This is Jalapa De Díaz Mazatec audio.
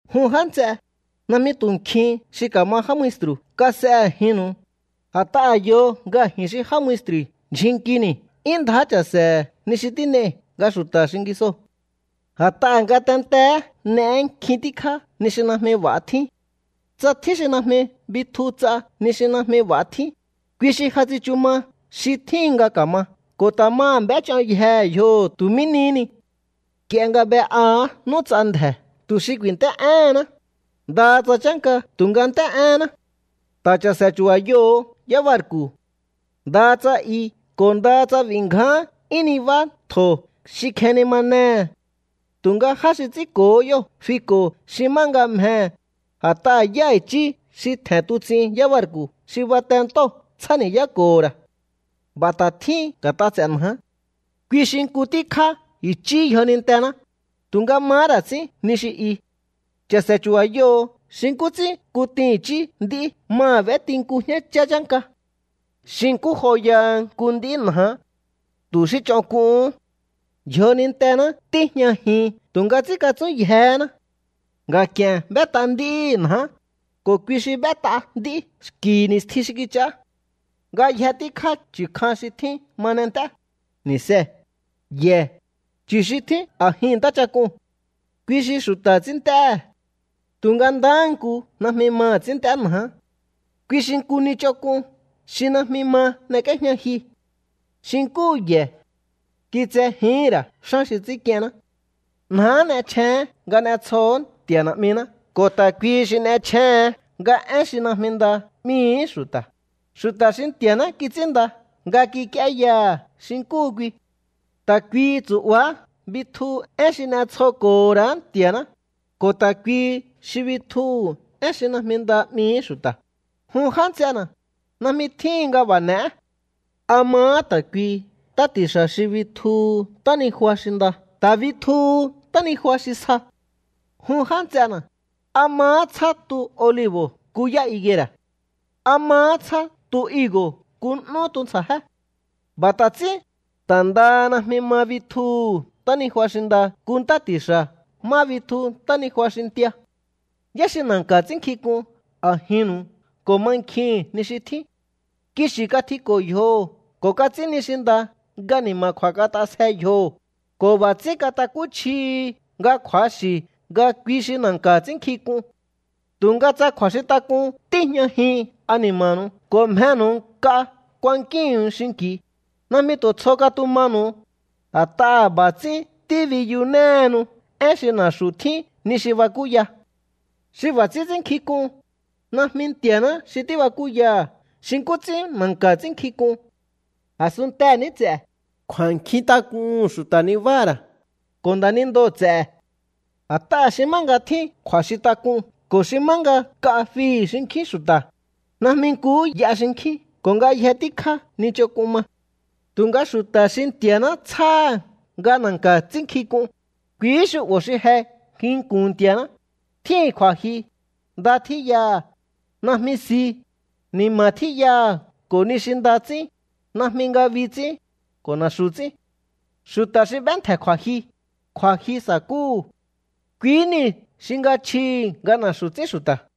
Jun já nts'e, najmi tu̱ nkjin xi ka̱ma já maestru̱ kas'e a̱jinnu̱u, a̱t'aha̱ yo nga ji̱n xi já maestru̱i̱ ndyjun nkini̱ 'yún ndjá cha̱se̱he̱ ni xi tín'ei̱ nga xu̱ta̱ xingisoo̱. A̱t'aha̱ ngatenteé n'eé nkjin tíkjá ni xi najmi b'a̱ tjín. Tsa tjín xi najmi bitju ts'a ni xi najmi b'a̱ tjín, kui xi ja tsichu ma xi tjíhin nga ka̱ma ko̱ ta̱ maha̱ b'éch'oyjehe̱ yjoho̱ tu̱ mí nihí ni. Nk'ie nga b'e'aha̱á n'úts'a ndje̱ tu̱ xi ku̱i̱nt'é'éhenná, ndaha tsa chánka tu̱nga nt'éhéná. Ta̱ cha̱se̱ chu̱ba̱yoho̱o yábarku̱. Ndaha tsa i ko̱ ndaha tsa b'i̱ ngján 'yún nibá ntjo̱ xi kjenimanehe̱, tu̱nga já xi ts'ínko̱hó yóo̱ fiko̱ xi má nga mjehe̱, a̱t'aha̱ yá i̱chí xi tje̱n tuts'in yábarku̱ xi bate ntóo̱ tsjáni̱yáko̱ho̱ ra̱. B'a̱ ta̱ tjín nga̱t'a ts'e̱ njaá. Kui xi nku tíkjá i̱chíhi̱ yjonintená, tu̱nga mahá ra̱ ts'ín ni xi i. Cha̱se̱ chu̱ba̱yoho̱o xi nkú ts'ín kutin i̱chí nd'í maha̱ b'éti nku jñáchá chánka. Xi nkú joyaha nku nd'í njaá. Tu̱ xí ch'onk'uhún. Yjonintená tíjñajin tu̱nga ts'ínkatsúnyjehéná. Nga̱k'i̱e̱n b'ét'a nd'íhi̱ njaá, ko̱ kui xi b'ét'a nd'í xki̱ ni̱stjin xi kich'aá. Ngayje tíkjá chu̱ kjan xi tjín ma n'ent'é, ni̱see̱, ye̱, chu̱ xi tjín a̱jin ntáchak'uu̱n. Kui xi xu̱ta̱ ts'ínnt'éhe̱. Tu̱nga ndahá nku najmi maha̱ ts'ínnt'é njaá. Kui xi nku ni ch'onk'un xi najmi ma n'ek'íéjña jyu. Xi nkúhu ye̱, kitsejíhi̱n ra̱ xán xi ts'ínk'ienná. Njaá n'echjéén nga n'etsjoo̱hó Nti̱a̱ Na̱'miná ko̱ ta̱ kuihi xi n'echjéén nga én xi najmi nda 'mihi̱í xu̱ta̱, xu̱ta̱ xi Nti̱a̱ná kits'ínnda nga kik'íéyaha̱ xi nkúhu kui. Ta̱ kuihi tsu̱'baá bitjuhu̱ én xi n'etsjoko̱ho̱ ra̱á Nti̱a̱ná, ko̱ ta̱ kuihi xi bitjuhu̱ én xi najmi nda 'mihi̱í xu̱ta̱. Jun já nts'ena̱, najmi tjíhin nga b'a̱ n'e̱é. ¿A mahá ta̱ kuihi ntá ti̱xa̱ xi bitjuhu̱ ntánijua xi nda ta̱ bitjuhu̱ ntánijua xi sja? Jun já nts'ena̱, ¿a mahá tsjá tu olibo̱ nku yá higuera̱? ¿A mahá tsjá tu higo̱ nku n'ú tuntsja̱jé? B'a̱ ta̱ ts'ín, ta̱ ndaha najmi ma bitjuhu̱ ntánijua xi nda nku ntá ti̱xa̱ má bitju ntánijua xi ntia. ¿Yá xi na̱nka̱ ts'ínnkjink'un a̱jinnu̱u ko̱ mankjihi̱n ni xi tjín? Kixi̱ katjiko̱ yjoho̱ ko̱ kats'ín ni xi nda nga ni̱ma̱kju̱a̱ kat'asje yjoho̱, ko̱ b'a̱ ts'ín katakúchjihi nga kju̱axi̱ nga kui xi na̱nka̱ ts'ínnkjink'un. Tu̱nga tsa kju̱a̱xintak'un tíjñajin ani̱ma̱nu̱u ko̱ mjenu̱u nk'a kuankíhu̱un xinki̱u, najmi tu̱ tsjo katumanu̱u, a̱t'aha̱ b'a̱ ts'ín tíbiyunéhenu én xi na̱xu̱ tjín ni xi bakúya. Xi b'a̱ ts'ín ts'ínkjínk'un, najmi Nti̱a̱ná xi tíbakúyaha̱ xi nkú ts'ín na̱nka̱ ts'ínkjínk'un. A̱sunntee̱ ní ts'e̱, kju̱a̱nkjintak'uhu̱n xu̱ta̱ nibáha̱ ra̱, ko̱ nda̱nindoo̱ ts'e̱. A̱t'aha̱ xi má nga tjín kju̱a̱xintak'un ko̱ xi má nga nk'a fihi̱ xinkjín xu̱ta̱, najmi nkuhú y'a xinkjín ko̱ ngayje tíkjá ni ch'onk'un ma. Tu̱nga xu̱ta̱ xi Nti̱a̱ná tsjáha̱ nga na̱nka̱ ts'ínnkjink'un, kuihí xu'bo̱ xi je nginku̱n Nti̱a̱ná, tjíhi̱n kju̱a̱jyu, nda tjíyaha̱, najmi si, ni̱ma̱ tjíyaha̱ ko̱ ni xi nda ts'ín, najmi ngabi ts'ín, ko̱ na̱xu̱ ts'ín. Xu̱ta̱ xi b'éntje̱ kju̱a̱jyu, kju̱jyu sa̱kúhu̱. Kui nii̱ xi nga chjihi̱ nga na̱xu̱ ts'ín xu̱ta̱.